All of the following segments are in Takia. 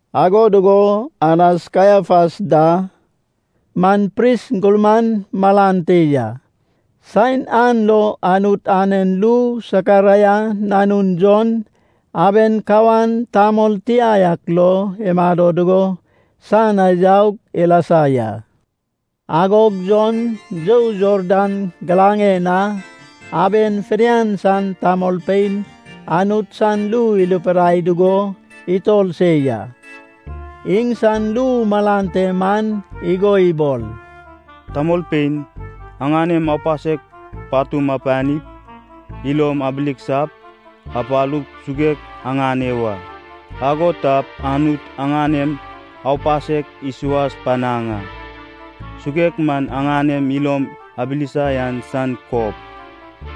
Ago dugo Anas, Kaiafas da man pris gurman malan te ya. Saen an lo Anut anen ru Sakaraia nanun Jon, aben kawan tamol tia yak lo imado dugo san na yaug ilasa ya. Agog Jon you Jordan giraŋen na aben fidian san tamolpein Anut san ru irupidai dugo itor se ya. Iŋsan ru malan te man igo ibol, “Tamolpein aŋanem aupasek patum apanip, ilom abileksap, apalup suguek aŋane wa. Ago tap Anut aŋanem aupasek isuas panaŋ a. Suguek man aŋanem ilom abilisa yan san kob.”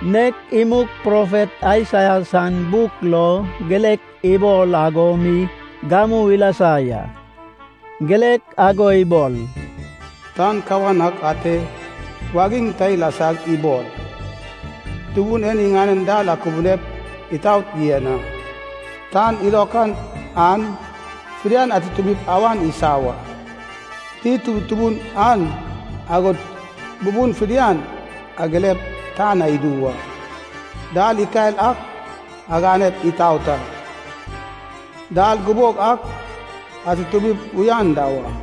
Nek imug profet Aisaia san buk lo girek ibol ago mi gamu ilasa ya. Girek ago ibol, “Tan kawan ak ate wagiŋ ta ilasag ibol, ‘Tubun en iŋanen dal akubunep itaot yen a. Tan ilokan an fidian atutumip awan isa wa. Did tutubun an, agod bubun fidian agilep tan na idu wa. Dal ikael ak aganep itaot a. Dal gubog ak atutumip uyan da wa.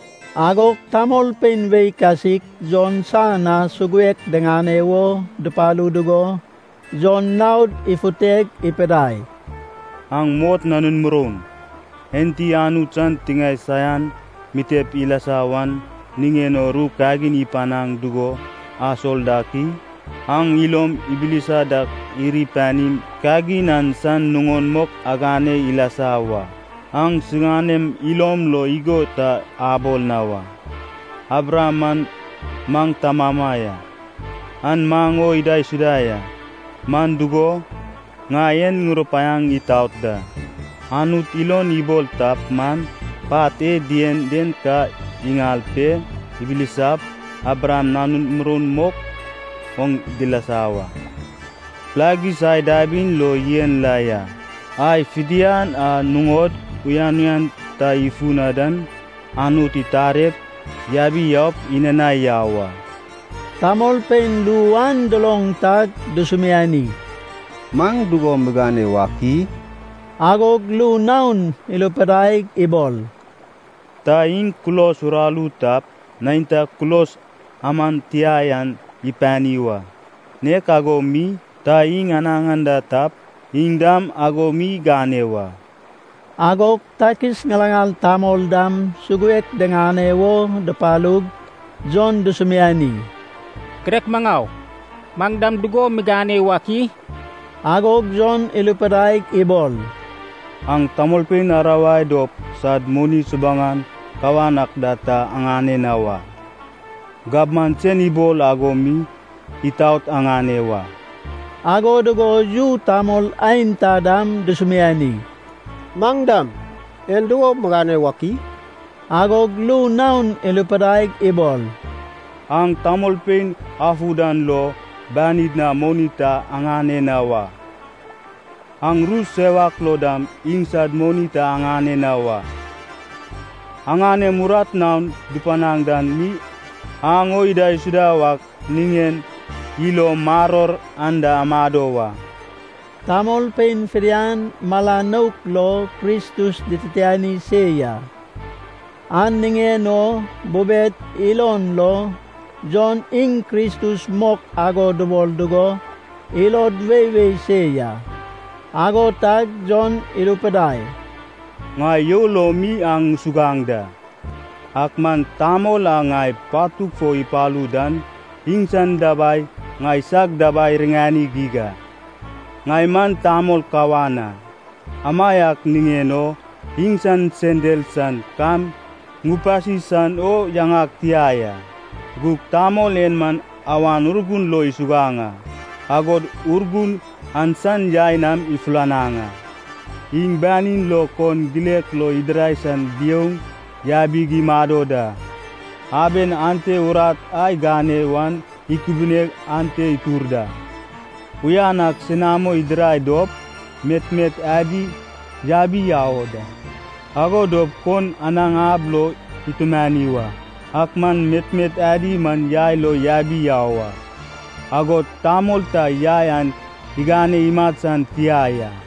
Agog tamolpein wei kasik Jon san na suguek diŋane wo dupalu dugo Jon naod ifuteg ipidai, “Aŋ mot nanun moroun! Enti Anut san tiŋae saian mitep ilasa wan niŋen o ru kagin ipanaŋ dugo asol dak i? Aŋ ilom ibilisa dak iri panim, kagin an san nuŋon mok agane ilasa wa. Aŋ siŋanem ilom lo igo ta abol na wa, ‘Abraham man maŋ tamama ya, an maŋ o idaisuda ya.’ Man dugo, ŋai en ŋurupaiaŋ itaot da, Anut ilon ibol tap man, pat e dien den ka iŋal pe ibilisap Abraham nanun muroun mok oŋ dilasa wa. Pilagis ai dabin lo yen la ya. Ai fidian a nuŋod uyan uyan ta ifu na dan, Anut itarep yabi yaup inanai yau a.” Tamolpein ru an duloŋ tag dusumiani, “Maŋ dugo migane wak i?” Agog ru naon irupidaig ibol, “Ta iŋ kulos uraru tap, neinta kulos aman tia yan ipani wa. Nek ago mi, ta iŋ anaŋ anda tap, iŋ dam ago mi igane wa.” Agog takis ŋilaŋal tamol dam suguek diŋane wo dupalug Jon dusumiani, “Girek maŋau, maŋ dam dugo migane wak i?” Agog Jon irupidaig ibol, “Aŋ tamolpein arawai dop sad moni subuŋan kawan ak da ta aŋane na wa. Gabman sen ibol ago mi itaot aŋane wa.” Ago dugo yu tamol aenta dam dusumiani, “Maŋ dam, en dugo migane wak i?” Agog ru naon irupidaig ibol, “Aŋ tamolpein afu dan lo banid na moni ta aŋane na wa. Aŋ ru sewak lo dam iŋsad moni ta aŋane na wa. Aŋanem urat naon dupanaŋ dan mi aŋ o idaisuda wak niŋen ilom maror anda amado wa.” Tamolpein fidian mala nouk lo Kristus dititiani se ya, an niŋen o bubed ilon lo Jon iŋ Kristus mok ago dubol dugo ilod weiwei se ya. Ago tag Jon irupidai, “Ŋai you lo mi aŋ ŋusuguaŋ da. Ak man tamol a ŋai patug fo ipalu dan iŋsan dabai ŋaisag dabai iriŋani geig a. Ŋai man tamol kawan a, amaiak niŋen o iŋsan sendal san kam ŋupasi san o yaŋag tia ya. Gug tamol en man Awan Urgun lo isuguaŋ a, agod Urgun an san yai nam ifulanaŋ a. Iŋ banin lo kon gilek lo idirai san biouŋ yabig imado da. Aben ante urat a igane wan ikubineg ante itur da. Uyan ak senamo idirai dop, metmet adi yabi yau o da. Ago dop kon anaŋ ab lo itumani wa. Ak man metmet adi man yai lo yabi yau a. Agod tamol ta yai an igane imat san tia ya.”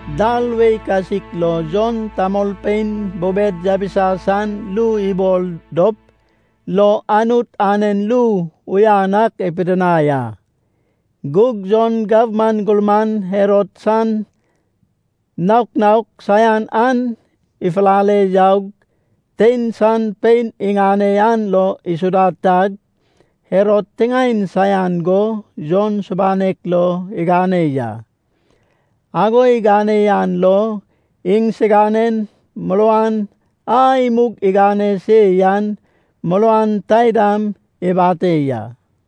Dal wei kasik lo Jon tamolpein bubed yabisa san ru ibol dop lo Anut anen ru uyan ak ipidinai a. Gug Jon gabman gurman Herod san naok naok saian an ifulale yaug, tein san pein iŋane an lo isuda tag, Herod tiŋaen saian go Jon subanek lo igane ya. Ago igane an lo iŋsiganen muruan a imug igane se yan muruan taidam ibate ya.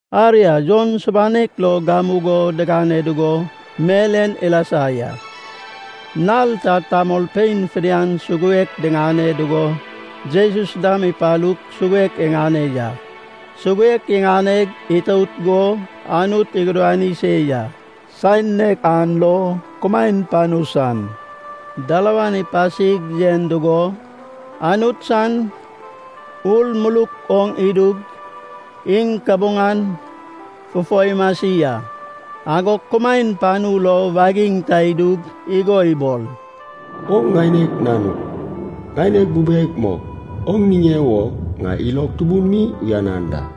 Aria, Jon subanek lo gamugo digane dugo mel en ilasa ya. Nal ta tamolpein fidian suguek diŋane dugo Jesus dam ipalug suguek iŋane ya. Suguek iŋaneg itout go Anut igudani se ya. Saen nek an lo kumaen panu san dalawan ipasig yen dugo, Anut san Ur muluk oŋ idug, iŋ kabuŋan fufo imasi a. Agog kumaen panu lo wagiŋ ta idug, igo ibol “Oŋ ŋaineg Nanug, ŋaineg bubeg mok, oŋ niŋe wo ŋai ilog tubun mi uyanan da.”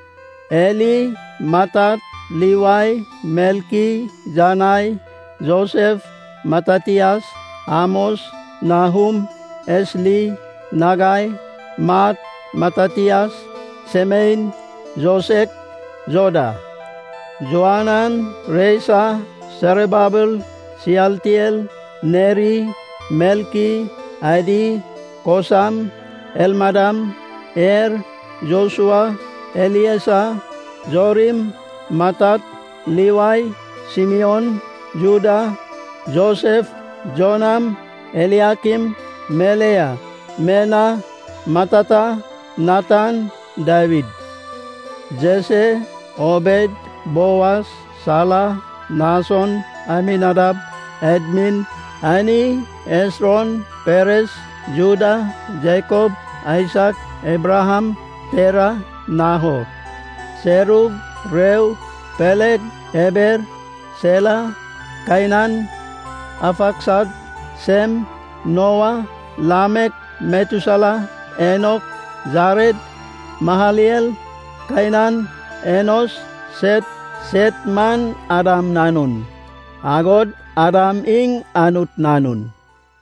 Eli, Matat, Livai, Melki, Janai, Josef, Matatias, Amos, Nahum, Esli, Nagai, Maat, Matatias, Semein, Josek, Joda, Joanan, Resa, Serababel, Sialtiel, Neri, Melki, Adi, Kosam, Elmadam, Er, Josua, Eliesa, Jorim, Matat, Livai, Simion, Juda, Josef, Jonam, Eliakim, Melea, Mena, Matata, Natan, Dawid, Jese, Obed, Boas, Sala, Nason, Aminadab, Admin, Arni, Esron, Peres, Juda, Jakob, Aisak, Abraham, Tera, Nahor, Serug, Reu, Peleg, Eber, Sela, Kainan, Arfaksad, Sem, Noa, Lamek, Metusela, Enok, Jared, Mahalelel, Kainan, Enos, Set. Set man Adam nanun, agod Adam iŋ Anut nanun.